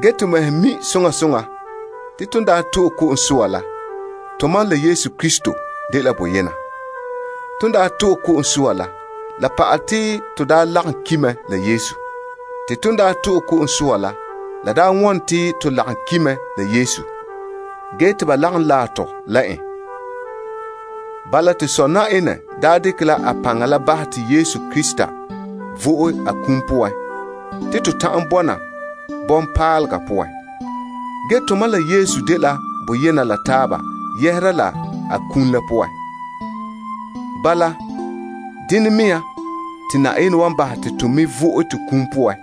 To mɛhe mi' soŋa soŋa te tomam daa to'e ko'om soa la, tomam la Yesu Krista dela boyena. Ton daa to'e ko'om soa la, to daa lagom ki' mɛ la Yesu. To ko'om soa la poan, to lagom ki' mɛ la Yesu. Ge te ba lagom laɛ tɔ la en. Bala, wo to Sɔ' Yenɛ n daa dekɛ a paŋa la bahɛ te Yesu Krista vo'e a kum la poan bala mea te tomam mɛ wan bɔna bɔŋpaalega poan. Tomam la Yesu dela boyena yɛhera la a kum la poan. Bala mea, te Yenɛ wan bahɛ te to me ta vo'e to kum poan,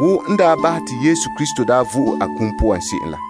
wo n daa bahɛ te Yesu daa vo'e a kum poan se'em la.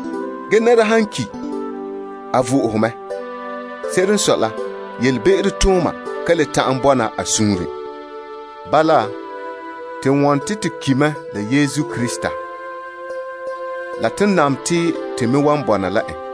Ge nɛra han ki, a vo'ohe mɛ. Se'ere n sɔe la, yelebe'ero tooma ka le ta'an bɔna a suunren. Bala, wo tomam ki la Yesu Krista la, to mi te to wan vɔna la en.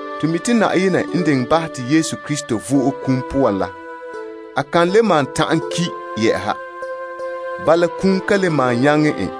To mi' te Yenɛ diŋɛ bahɛ te Yesu Krista vo'e a kum la poan, a ka le malom ki, kum ka le malom nyaŋɛ en.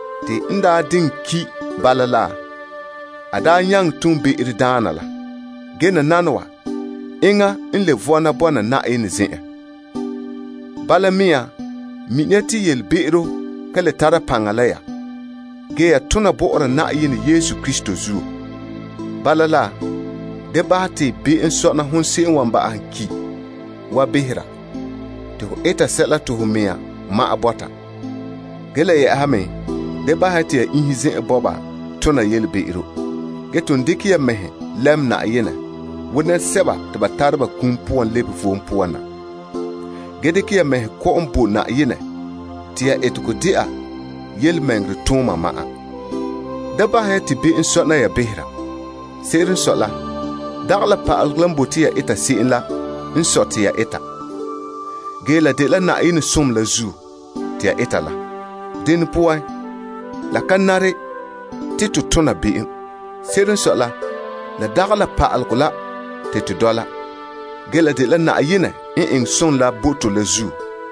N daa diŋɛ ki bala la, be'em ka le tana en. Ge nananawa, a nya boe la Yenɛ zen'en. Bala mea, mini ya te han dɛna be'em to ki mɛ ge ya boe mɛ la Yenɛ Yesu Krista zuo. Bala la, da bahɛ te be'em sɔna ya iŋgana wa behera te ya eta sɛla te ya bɔŋkɛka la bɔta. Ya me da le bahɛ ya te ya iinhe zen'sɛka tona toonfɛn'ɛha. Ge ton dekɛ ya ya mɛhe lɛm Yenɛ wo nɛresɛba te ba tara ba kum poan lebe vom poan na. Dekɛ ya mɛhe kɔ'ɔn bo Yenɛ te ya etegɔ dɛna tontɔɔtooma ma'an. Da bahɛ ya te be'em sɔna ya behera. Se'ere n sɔe la, la dagɛ la pa'alegɔ la n sɔe te ya eta ge la dela Yenɛ zo'ohogɔ la zuo, te ya eta. Dene poan la ka nare te to tona be'em. Se'ere n sɔe la, la dagɛ la pa'alegɔ la te to dɔla. La dela Yenɛ n eŋɛ som la bo to la zuo.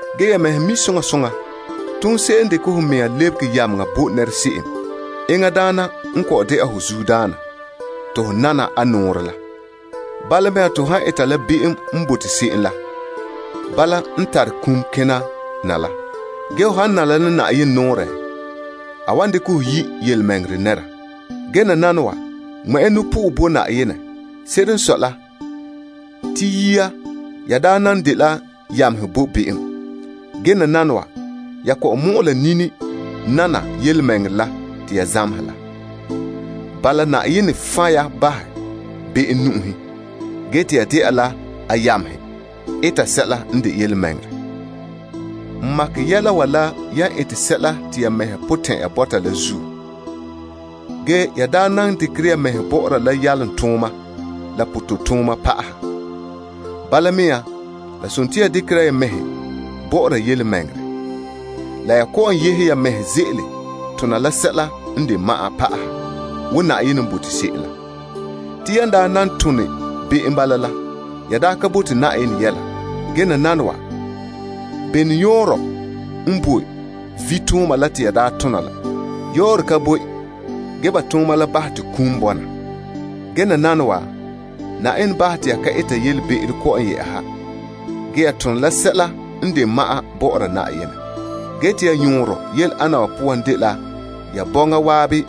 Ya mɛhe mi' soŋa soŋa te hon se'em n dekɛ ho mea lebege yameŋa bo nɛra se'em, enŋa daana n de ho zuodaana te ho nana a nɔɔrɛ la. Bala ho zuodaana han dɛna la be'em la tare kum kena na. Ge ho han nana la Yenɛ nɔɔrɛ, a wan yi' ho yelemɛŋɛrɛ nɛra. Ge nananawa, pɛngɛ ya Yenɛ. Se'ere n sɔe la, te yia ya daa nan dela yamehe bo be'em. Gee nananawa, ya kɔ'ɔn mɔ'ɛ la nini nana yelemɛŋɛrɛ la te ya zamehɛ la. Yenɛ fan' ya be'em nu'uhen bahɛ, ge te ya nya dɛna la a yamehe eta sɛla n de yelemɛŋɛrɛ. N tare la ya mɛhe en ete sɛla la magaha bɔ'ɔra ya, la yan ka bɔkere la zuo. Ge ya daa nan dekere ya mɛhe bɔ'ɔra la yalomtooma la toonfɛn'ɛha. Bala mea te yan dekera ya mɛhe bɔ'ɔra yelemɛŋɛrɛ la. Ge kɔ'ɔn yehe ya mɛhe ze'ele tona la sɛla n de ma'an, wo Yenɛ n bote se'em la. Yan daa nan be'em yamehe la, ya da ka bote tontɔɔ vom yɛla. Nananawa, bene yɔɔrɛ n boe vitooma la te ya daa tona la poan? Yɔɔrɛ ka boe, ya tooma la bahɛ te kum n bɔna. Ge nananawa, Yenɛ bahɛ te ya bɔna la fai dɛna Yenɛ yamehe, te ya yɔɔrɔ dela ya bɔŋa zan'an dekɛ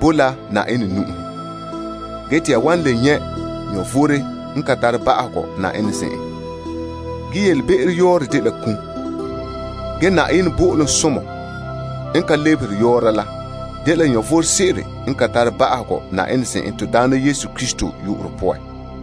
bo la Yenɛ ge te ya wan le nyɛ' vom n ka tare ba'ahegɔ Yenɛ zen'en. Ge be'em yɔɔrɛ dela kum. Ge Yenɛ zaŋa bo'olom la dela vom sebo n ka tare ba'ahegɔ to Daana Yesu Krista poan.